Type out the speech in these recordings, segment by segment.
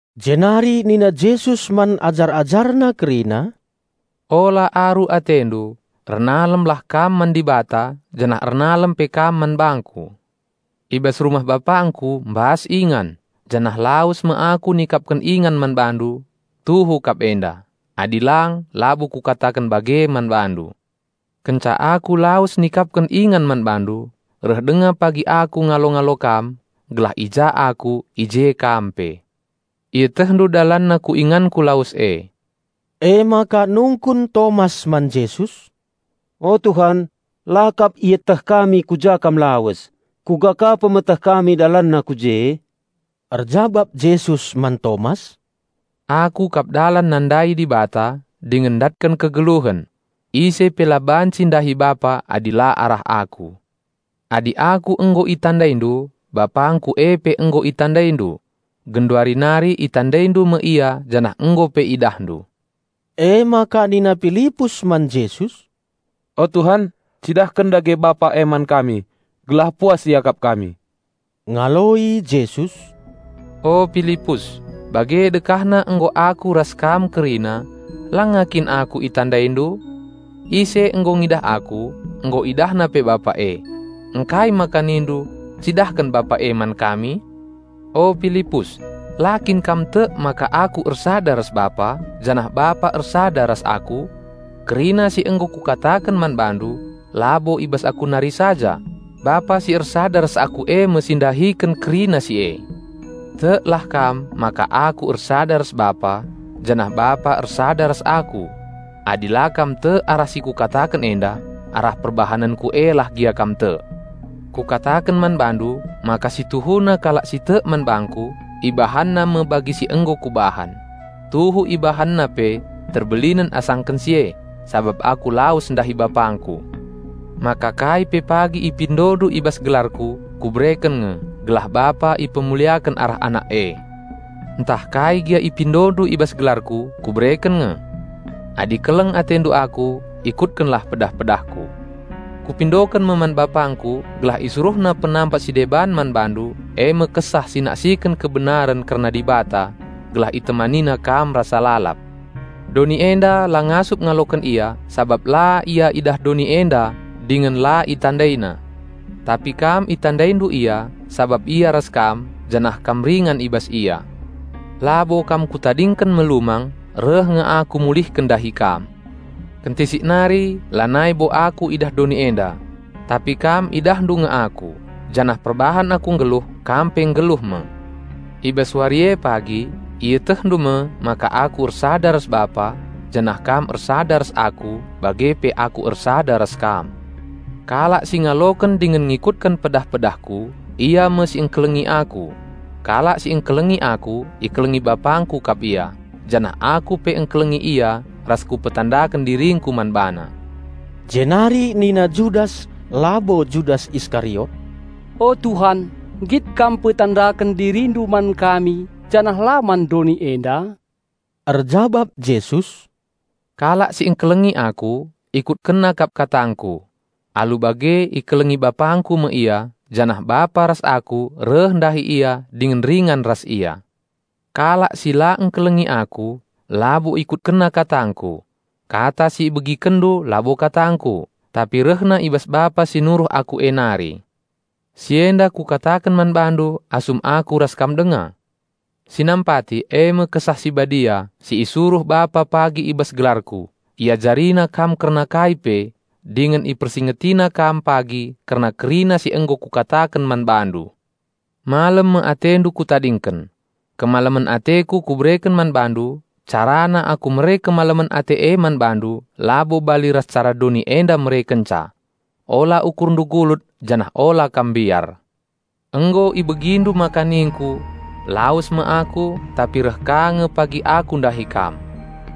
Jenari nina Jesus man ajar-AjarNa kerina, "Ola aru atendu. Ernalemlah kam man Dibata janah ernalem pe kam man bangKu. I bas rumah BapangKu mbas ingan; janah lawes me Aku nikapken ingan man bandu. Tuhu kap enda; adi lang labo Kukataken bage man bandu. Kenca Aku lawes nikapken ingan man bandu, reh denga pagi Aku ngalo-ngalo kam, gelah i ja Aku i je kam pe. Ietehndu dalanna ku inganKu lawes e." Emaka nungkun Tomas man Jesus, "O Tuhan, la kap ieteh kami ku ja Kam lawes; kuga ka pemeteh kami dalanna ku je?" Erjabap Jesus man Tomas, "Aku kap dalan nandai Dibata, dingen ndatken kegeluhen. Ise pe la banci ndahi Bapa adi la arah Aku. Adi Aku nggo itandaindu, BapangKu e pe nggo itandaindu. Genduari nari itandaindu me Ia janah nggo pe idahndu." Emaka nina Pilipus man Jesus, "O Tuhan cidahken dage Bapa e man kami, gelah puas iakap kami." Ngaloi Jesus, "O Pilipus, bage dekahna nggo Aku ras kam kerina, langa kin Aku itandaindu? Ise nggo ngidah Aku, nggo idahna pe Bapa e. Ngkai maka nindu, 'Cidahken Bapa e man kami?' O Pilipus, la kin kam tek maka Aku ersada ras Bapa, janah Bapa ersada ras Aku? Kerina si nggo Kukataken man bandu, labo i bas Aku nari saja. Bapa si ersada ras Aku e me si ndahiken kerina si e. Teklah kam maka Aku ersada ras Bapa, janah Bapa ersada ras Aku. Adi la kam tek arah si Kukataken enda, arah perbahanenKu e lah gia kam tek. Kukataken man bandu maka situhuna kalak si tek man bangKu, ibahanna me bagi si nggo Kubahan. Tuhu ibahanna pe terbelinen asangken si e, sabap Aku lawes ndahi BapangKu. Maka kai pe pagi ipindondu i bas gelarKu, Kubereken nge, gelah Bapa ipemuliaken arah Anak e. Ntah kai gia ipindondu i bas gelarKu, Kubereken nge." "Adi keleng atendu Aku, ikutkenlah pedah-pedahKu. Kupindoken me man BapangKu gelah IsuruhNa Penampat si deban man bandu e me Kesah si naksiken kebenaren kerna Dibata, gelah ItemaniNandu rasa lalap. Doni enda la ngasup ngaloken Ia sabap la Ia idah doni enda dingen la itandaina. Tapi kam itandaindu Ia sabap Ia ras kam, janah kam ringan i bas Ia. Labo kam Kutadingken melumang. Reh nge Aku mulihken ndahi kam. Kentisik nari, lanai bo Aku idah doni enda. Tapi kam idahndu nge Aku janah perbahan Aku nggeluh, kam pe nggeluh me. I bas wari e pagi, ietehndu me maka Aku ersada ras Bapa, janah kam ersada ras Aku bage pe Aku ersada ras kam. Kalak si ngaloken dingen ngikutken pedah-pedahKu, ia me si engkelengi Aku. Kalak si engkelengi Aku ikelengi BapangKu kap ia; janah Aku pe engkelengi ia ras Kupetandaken diringKu man bana." Jenari nina Judas (labo Judas Iskariot), "O Tuhan nggit Kam mpetandaken DiriNdu man kami, janah la man doni enda?" Erjabap Jesus, "Kalak si engkelengi Aku, ikutkenna kap katangKu. Alu bage ikelengi BapangKu me ia, janah Bapa ras Aku reh ndahi ia dingen ringan ras ia. Kalak si la engkelengi Aku, labo ikutkenna katangKu. Kata si ibegikenndu labo katangKu tapi rehna i bas Bapa si nuruh Aku e nari. Si enda Kukataken man bandu asum Aku ras kam denga. Si nampati, eme Kesah Si Badia, si isuruh Bapa pagi i bas gelarKu, IajariNandu kerna kai pe; dingen IpersingetiNandu pagi kerna kerina si nggo Kukataken man bandu. Malem me atendu Kutadingken; Kemalemen ateKu Kubereken man bandu. Carana Aku mere kemalemen ate e man bandu labo bali ras cara doni enda merekenca. Ola ukurndu gulut janah ola kam mbiar. Nggo ibegindu maka ningku, 'Lawes me Aku, tapi reh ka nge pagi Aku ndahi kam.'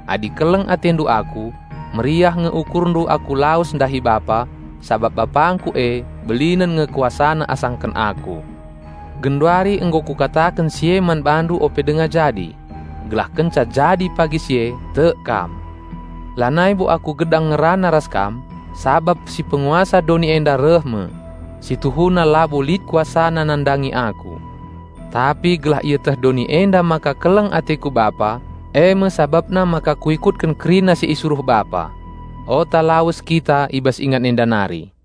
Adi keleng atendu Aku, meriah nge ukurndu Aku lawes ndahi Bapa, sabap BapangKu e belinen nge KuasaNa asangken Aku. Genduari nggo Kukataken si e man bandu ope denga jadi; gelah kenca jadi pagi si e tek kam. Lanai bo Aku gedang ngerana ras kam, sabap si Penguasa doni enda reh me. Si tuhuna labo lit kuasana nandangi Aku. Tapi gelah ieteh doni enda maka keleng ateKu Bapa, e me sabapna maka Kuikutken kerina si isuruh Bapa. Ota lawes kita i bas ingan enda nari."